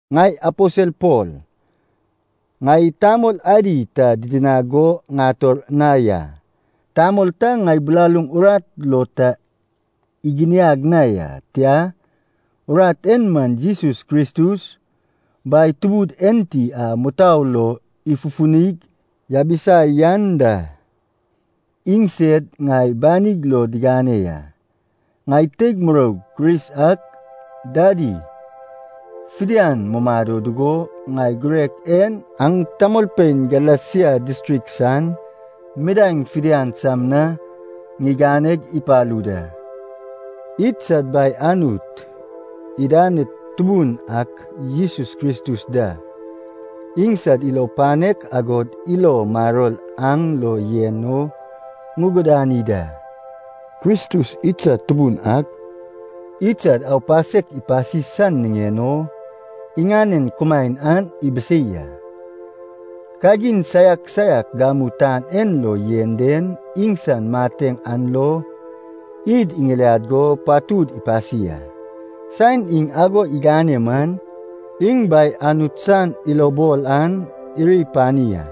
Ŋai aposel Pol. Ŋai tamol adi ta didinag go ŋator na ya. Tamol ta ŋai bilaluŋ urat lo ta iginiag na ya. Tia, urat en man Jesus Kristus, Bai Tubud enti a mutou lo ifufunig yabisa yan da, iŋsed ŋai banig lo digane ya. Ŋai teig muroug Kris ak dadi fidian mumado dugo, ŋai girek en aŋ tamolpein Galesia distrik san midaeŋ fidian sam na ŋiganeg ipalu da. Idsad Bai Anut, idaned Tubun ak Jesus Kristus da, iŋsad ilo panek agod ilo maror aŋ lo yen o ŋugudani da. Kristus idsad Tubun ak, idsad aupasek ipasi san niŋen o, iŋanen kumaen an ibisei a. Kagin saiak saiak gamu tan en lo yen den, iŋsan mateŋ an lo id iŋiliad go patud ipasi a. Saen iŋ ago igane man, iŋ Bai Anut san ilobol an iri pani a.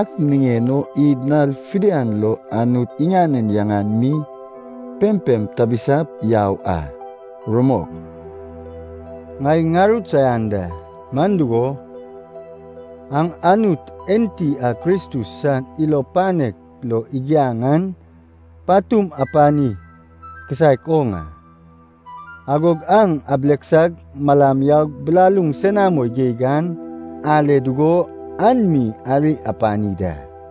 Ak niŋen o id nal fidian lo Anut iŋanen yaŋan mi pempem tabisap yau a. Rumok. Ŋai ŋarut saian da, man dugo, aŋ Anut enti a Kristus san ilo panek lo igiaŋ an patum apani kisaek oŋ a. Agog aŋ abileksag malam yaug bilaluŋ senamo geig an ale dugo an mi ari apani da.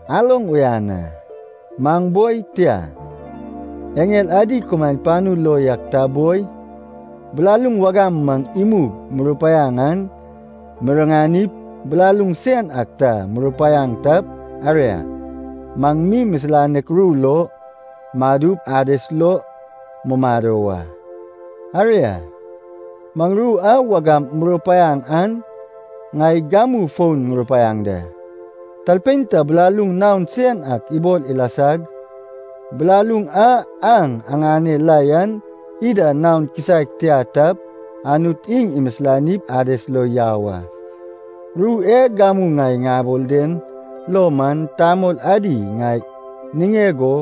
Aloŋ uyan a. Maŋ boi, tia, eŋel adi kumaen panu lo yak ta boi, bilaluŋ wagam maŋ imug murupaiaŋ an miriŋanip, bilaluŋ sen ak ta murupaiaŋ tap, aria, maŋ mi misilanek ru lo madup Ades lo mumado wa. Aria, maŋ ru a wagam murupaiaŋ an ŋai gamu fon ŋurupaiaŋ da. Talpein ta bilaluŋ naon sen ak ibol ilasag, bilaluŋ a aŋ aŋane la yan ida naon kisaek tia tap, Anut iŋ imisilanip Ades lo yau a. Ru e gamu ŋai ŋabol den lo man, tamol adi ŋai niŋeg o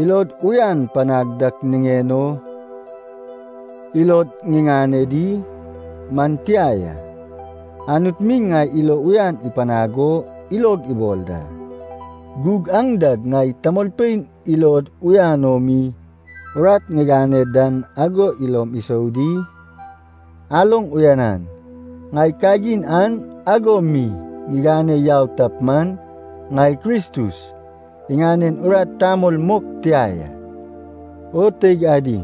ilod uyan panag dak niŋen o ilod ŋiŋane di? Man tia ya, Anut mi ŋai ilo uyan ipanag o ilog ibol da. Gug aŋ dag ŋai tamolpein ilod uyan o mi urat ŋigane dan ago ilom isou di? Aloŋ uyanan. Ŋai kagin an ago mi ŋigane yau tap man, ŋai Kristus iŋanen urat tamol mok tia ya. O teig adi,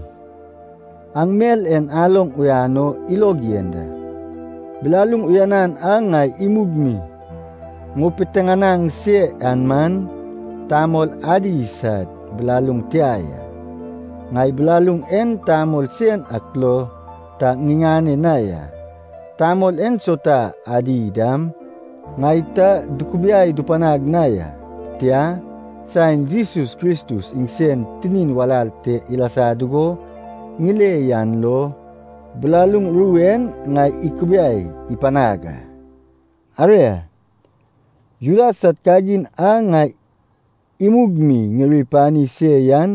aŋ mel en aloŋ uyan o ilog yen da. Bilaluŋ uyanan a ŋai imug mi ŋupiteŋanaŋ se yan man, tamol adi sad bilaluŋ tia ya. Ŋai bilaluŋ en tamol sen ak lo ta ŋiŋane na ya. Tamol ensauta adi dam ŋai ta dukubiai dupanag na ya. Tia, saen Jesus Kristus iŋsen tinin walal te ilasa dugo ŋile yan lo, bilaluŋ ru en ŋai ikubiai ipanag a. Aria, Juda sad kagin a ŋai imug mi ŋiri pani se yan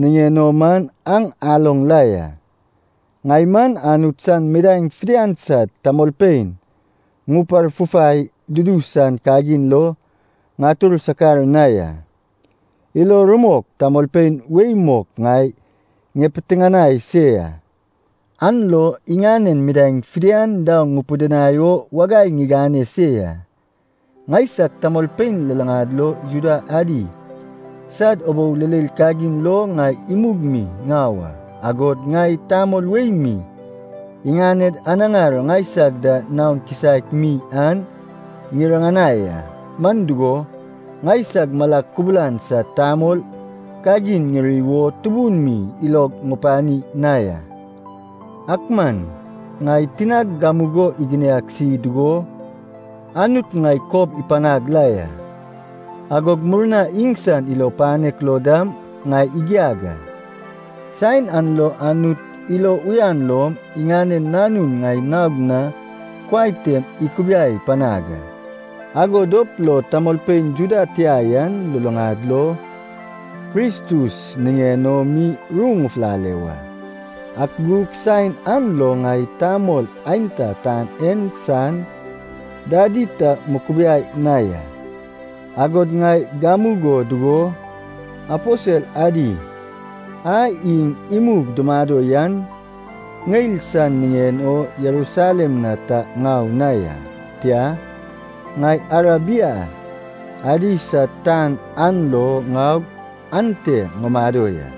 niŋen o man aŋ aloŋ la ya. Ŋai man Anut san midaeŋ fidian sad tamolpein ŋuparfufai dudu san kagin lo ŋatur sakar na ya. Ilo rumok tamolpein wei mok ŋai ŋipitiŋinai se ya, an lo iŋanen midaeŋ fidian daoŋ ŋupidinai o wagai ŋigane se ya. Ŋaisag tamolpein luluŋad lo Juda adi sad ubou leil kagin lo ŋai imug mi ŋau a, agod ŋai tamol wei mi iŋaned anaŋar ŋaisag da naon kisaek mi an ŋiriŋanai a. Man dugo, ŋaisag malag kubulan sad tamol kagin ŋiri wo tubun mi ilog ŋupani na ya. Ak man, ŋai tinag gamugo iginiagsi dugo Anut ŋai kob ipanag la ya, agog murnag iŋsan ilo panek lo dam ŋai igiag a. Saen an lo Anut ilo uyan lom, iŋanen Nanun ŋai naog na kuai tem ikubiai panag a. Ago dop lo tamolpein Juda tia yan luluŋad lo Kristus niŋen o mi ru ŋufulale wa. Ak gug saen an lo ŋai tamol aenta tan en san dadi ta mukubiai na ya. Agod ŋai gamugo dugo aposel adi a iŋ imug dumado yan, ŋeil san niŋen o Jerusalem na ta ŋau na ya. Tia, ŋai Arabia adi sad tan an lo ŋaug ante ŋumado ya.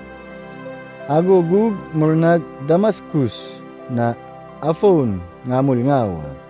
Ago gug murnag Damaskus na afon ŋamul ŋau a.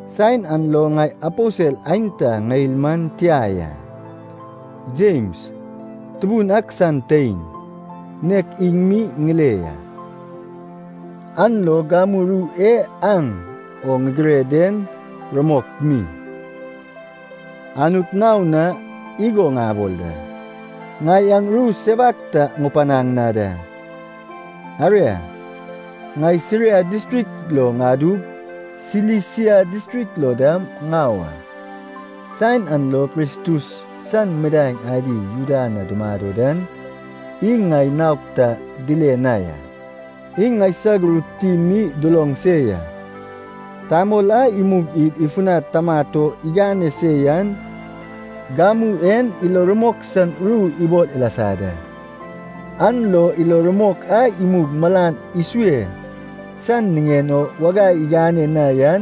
Saen an lo ŋai aposel aenta ŋeil man tia ya. Jems, Tubun ak san tein, nek iŋ mi ŋile ya. (An lo gamu ru e aŋ o ŋigire den, rumok mi, Anut naon na igo ŋabol da, ŋai aŋ ru sewak ta ŋupanaŋ na da.) Aria, ŋai Siria distrik lo ŋadug, Silisia distrik lo dam ŋau a. Saen an lo Kristus san midaeŋ adi Juda na dumado dan iŋ ŋai naog ta dile na ya. Iŋ ŋaisag ru tim mi duloŋ se ya, “Tamol a imug id ifunad tamat o igane se yan, gamu en ilo rumok san ru ibol ilasa da. An lo ilo rumok a imug malan isue san niŋen o wagai igane na yan,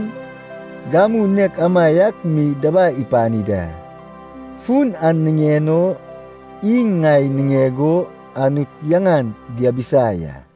gamu nek amaiak mi dabai ipani da.” Fun an niŋen o iŋ ŋai niŋeg o Anut yaŋan diabisa ya.